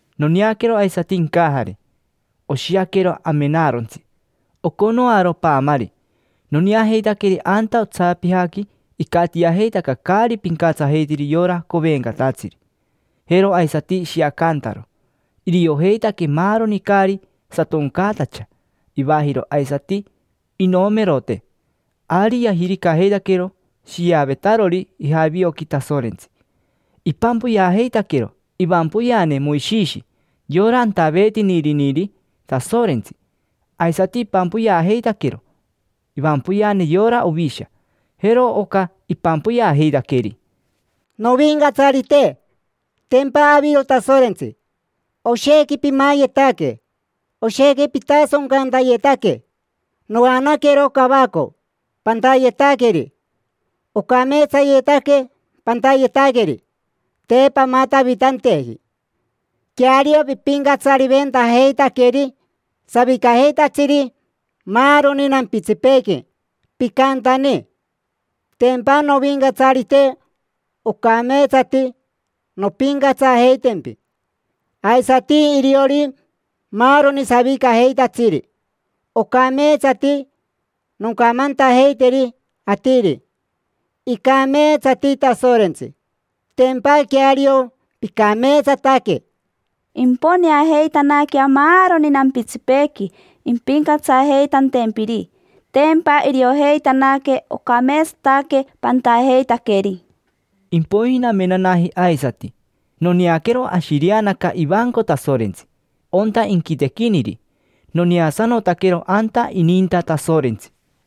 Noneaquero aisati incajare, oshiaquero amenarontsi, oconoaro paamari. Noneajeitaqueri anta otsapijaqui icatiajeitaca caari pincatsajeitiri yora covencatatsiri, jero aisati ishiacantaro; iriojeitaque maaroni caari satoncaatacha ivajiro aisati inomerote. Ari yajiricajeitaquero shiavetarori ijavioqui Tasorentsi. Ipampoyeajeitaquero ivampoyeane Moishishi, yora antaveetiniriniri Tasorentsi. Aisati ipampoyeajeitaquero ivampoyeane yora Ovisha. Jero oca ipampoyeajeitaqueri: Novincatsarite, tempa aviro Tasorentsi, oshequi pimayetaque. Oshequi pitasoncantayetaque, noanaquero cavaco pantayetaqueri. Ocameetsayetaque pantayetaqueri, te pamatavitanteji. Queario, pipincatsariventajeitaqueri savicajeitatsiri maaroni nampitsipeequi, picantani. Tempa, Novincatsarite, ocameetsati nompincatsajeitempi, aisati iriori maaroni savicajeitatsiri. Ocameetsati noncamantajeiteri atiri: “Icameetsati Tasorentsi”; tempa queario, picameetsataque. Imponeajeitanaquea maaroni nampitsipeequi impincatsajeitantempiri. Tempa iriojeitanaque ocameetsataque pantajeitaqueri. Impoiji namenanaji aisati, noneaquero ashireanaca ivanco Tasorentsi, onta inquitequiniri. Noneasanotaquero anta ininta Tasorentsi.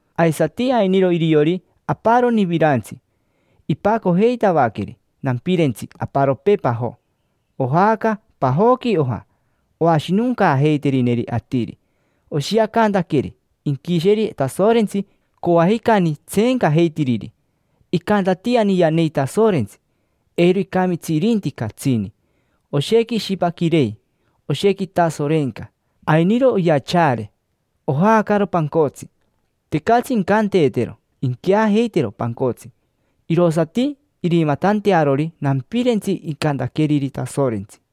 Aisati ainiro iriori aparoni virantsi, ipacojeitavaqueri nampirentsi aparopee pajo. Ojaaca pajoqui oja, oashinoncaajeiterineri atiri. Oshiacantaqueri inquisheri Tasorentsi coajicani tseencajeitiriri. Icantatiani yanei Tasorentsi, eiro icamitsi irinti catsini. Oshequi ishipaquirei, oshequi itasorenca; ainiro oyachaare, ojaacaro pancotsi. Tecatsi incanteetero inqueajeitero pancotsi, irosati irimatantearori nampirentsi icantaqueriri Tasorentsi.